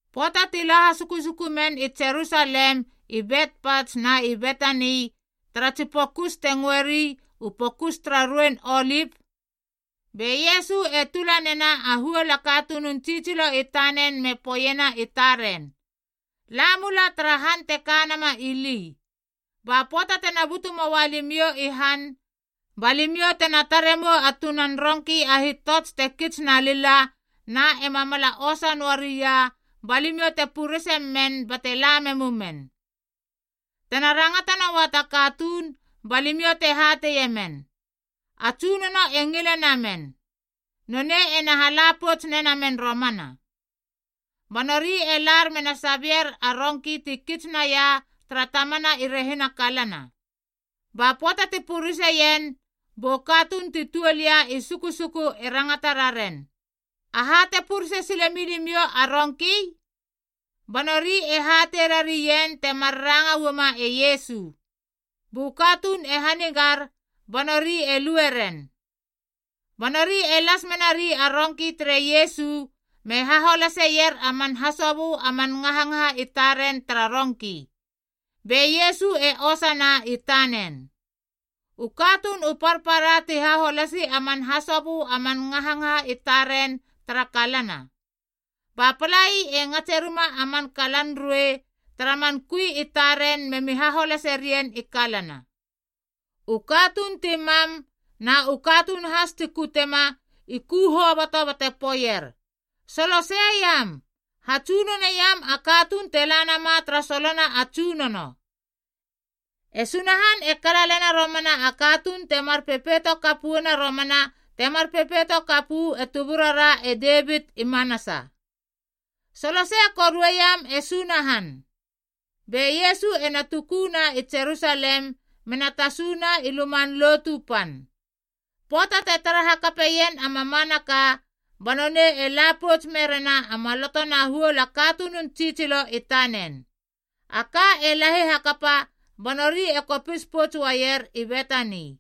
Pöata ti la hasukusuku men i Jerusalem i Betpats na i Betani tara tsi pokus te ngöeri u Pokus tara Ruein Olip. Be Iesu e tula nena a huol a katunun tsitsilo i tanen me poeiena i taren, “La mula tara han te ka nama ili, ba pöata tena butu moa limiou i han ba limiou tena tare mou a tunan rongki a hitots te kits na lila na ema mala osa noaria ba limiou te purese men bate la memumen. Tena rangata noua ta katuun, ba limiou te hateie men, A Tsunono e ngile namen, nonei ena hala pouts nenamen romana.” Ba nori e lar mena sabier a rongki ti kits naia tara tamana i rehina kalana. Ba pöata ti pureseien bu katuun ti tuol ia i sukusuku e rangata raren, “Aha te purese sile milimiou a rongki?” Ba nori hatei rarien temar ranga uama e Iesu. Bu katuun e hanigar ba nori e lueren. Ba nori e las menari a rongki tere Iesu me haholaseier a man hasobö a man ngahangaha i taren tara rongki, be Iesu e osana i tanen. U katuun u parpara ti haholasi a man hasobö a man ngahangaha i taren tara kalana, ba palai e ngatse rima a man kalan ruei memi haholase rien i kalana. U katuun ti mam na u katuun has ti kutema i ku hoboto bate poeier, “Soloseiam! Hatsunoneiam a katuun te la nama tara solona a Tsunono! E Sunahan e kalalena romana a katuun temar pepeito kap uana romana temar pepeito kap uu e tuburara e Devit i manasa. Solosei korue iam e Sunahan!” Be Iesu ena tuku na i Jerusalem mena tasuna i Luman Lotu Pan. Pöata te tara hakapaien a mamanaka ba nonei e la pouts merena a maloto na huol a katunun tsitsilo i tanen. A ka e lahi hakapa ba nori e kopis pouts uaier i Betani.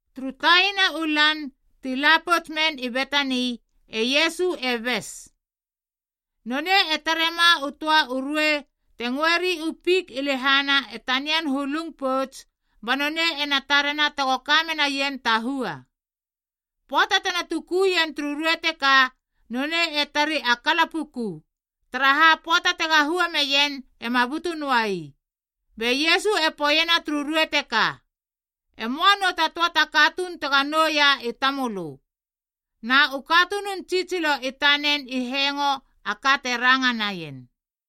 Turu taina u lan, ti la pouts men i Betani, e Iesu e bes. Nonei e tare ma u töa u ruei te ngöeri u fik i lehana e tanian hulung pouts ba nonei ena tarena tego ka menaien ta hua. Pöata tena tukuien turu ruei teka, nonei e tari a kala puku, taraha a pöata tega hua meien ema butu noa ii. Be Iesu e poeiena turu ruei teka, “E möa nou ta töa ta katuun tego nouia i tamölö.” Na u katunun tsitsilo i tanen i hengo a ka te ranga naien.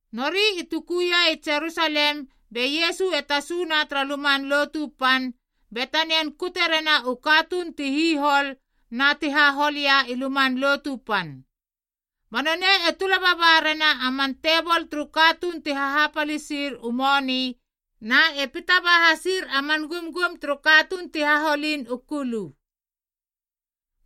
Nori i tukuia i Jerusalem be Iesu e tasuna tara Luman Lotu Pan be tanian kute rena u katuun ti hihol na ti hahol ia i Luman Lotu Pan. Ba nonei e tula baba rena a man tebol turu katuun ti hahapalisir u moni na e pita ba hasir a man gumgum turu katuun ti haholin u kulu.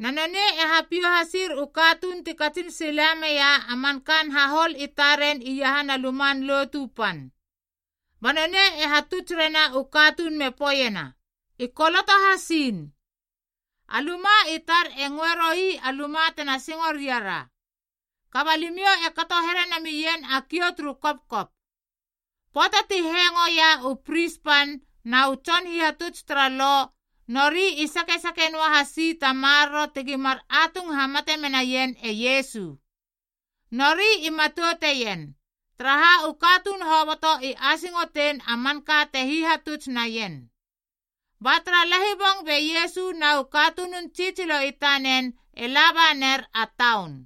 Na nonei e hapiou hasir u katuun ti katsin sila meia a man kaan hahol i taren iahana Luman Lotu Pan. Ba nonei e hatuts rena u katuun me poeiena, “I koloto hasiin, ‘A luma i tar e ngöe roi a luma tena singo ria ra.’ “Kaba alimiou e kato here namien a kiou turu kopkop.” Pöata ti hengoia u pris pan na u tson hihatuts tara Lo, nori i sakesake noahasi ta maroro tegi mar atung hamate menaien e Iesu. Nori i matouteien, taraha u katuun hoboto i asingotein a manka te hihatuts naien. Ba tara lahibong be Iesu na u katunun tsitsilo i tanen e laba ner a taun.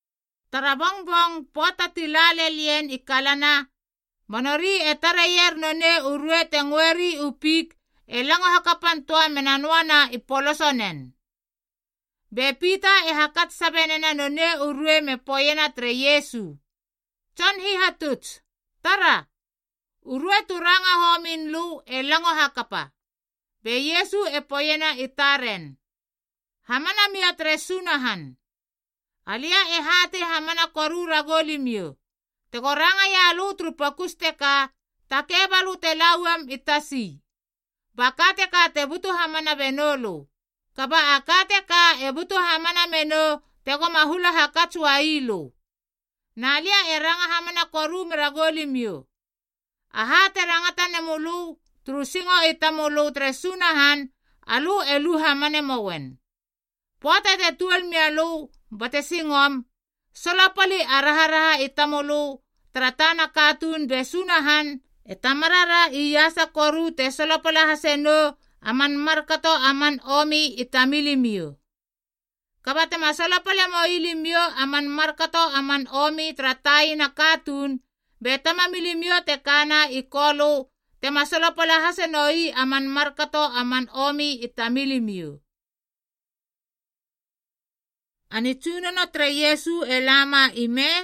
Tara bongbong, pöata ti la lel ien i kalana, ba nori e tareier nonei u ruei te ngöeri u fik e lango hakapan töa mena noana i polosonen. Be Pita e hakats sabe nena nonei u ruei me poeiena tere Iesu, “Tson Hihatuts, tara! U ruei tu ranga homin lö e lango hakapa.” Be Iesu e poeiena i taren, “Hamana mia tere Sunahan. Alia e hatei hamana koru ragou limiou, tego rangaia lö turu pokus teka, ‘takei balö te la uam i tasi,’ ba ka teka te butu hamana benoulö. Kaba a ka teka e butu hamana menou tegoma hula hakats uai lö. Na lia e ranga hamana koru meragou limiou, aha te rangata nemölö turu singo i tamölö tere Sunahan alö e lu hamane mouen. Pöata te tuol mialö bate singom, solopali a raharaha i tamölö tara tana katuun be Sunahan e Tamarara iasa koru te solopala hase nou a man markato a man omi i tamilimiou. Kaba tema solopale moi limiou a man markato a man omi tara taina katuun, be Tamamilimiou te kana i Kolö tema solopala hase noi a man markato a man omi i tamilimiou.” A nitsunono tere Iesu e lama ime?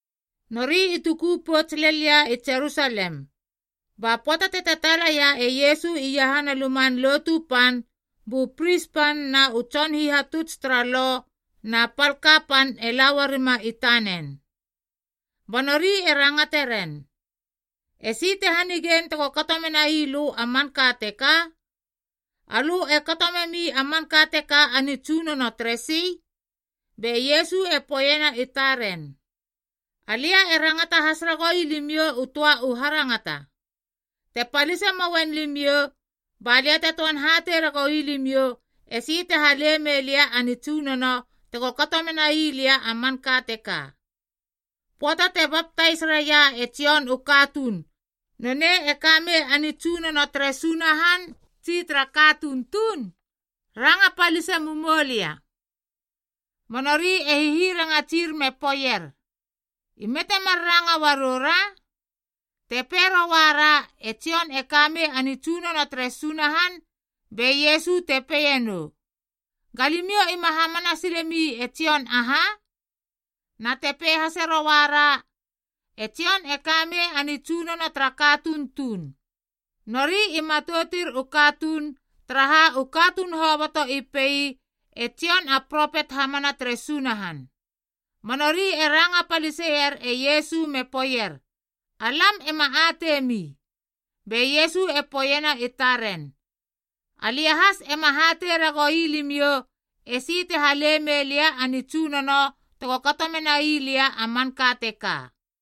Nori i tuku pouts lel ia i Jerusalem. Ba pöata te tataala laia e Iesu iahana Luman Lotu Pan, bu pris pan na u tson hihatuts tara Lo na pal kapan e la uarima i tanen. Ba nori e rangate ren, “Esi te hanigein tego kato menai lö a manka teka? Alö e kato memi a manka teka a nitsunono teresi?” Be Iesu e poeiena i taren, “Alia e rangata has ragoui limiou u töa u harangata. Te palise moien limiou, ba lia te töan hatei ragoui limiou esi te hale mei lia a nitsunono tego kato menai lia a manka teka. Pöata te baptais raia e Jon u katuun, nonei e ka mei a nitsunono tere Sunahan tsi tara katuun tuun? Ranga palise mumoulia.” Ba nori e hihirangatsir me poeier, “Ime temar ranga uarou ra? Te pei rouara, ‘E Jon e ka mei a nitsunono tere Sunahan,’ be Iesu te peie nou, ‘Ga limiou ima hamana sile mi e Jon aha?’ Na te pei hase rouara, ‘E Jon e ka mei a nitsunono tara katuun tuun.’” Nori i matoutir u katuun, taraha u katuun hoboto i pei e Jon a propet hamana tere Sunahan. Ba nori e ranga paliseier e Iesu me poeier, “Alam ema atei mi.” Be Iesu e poeiena i taren, “Alia has ema hatei ragou ii limiou esi te hale mei lia a nitsunono tego kato mena ii lia a manka teka.”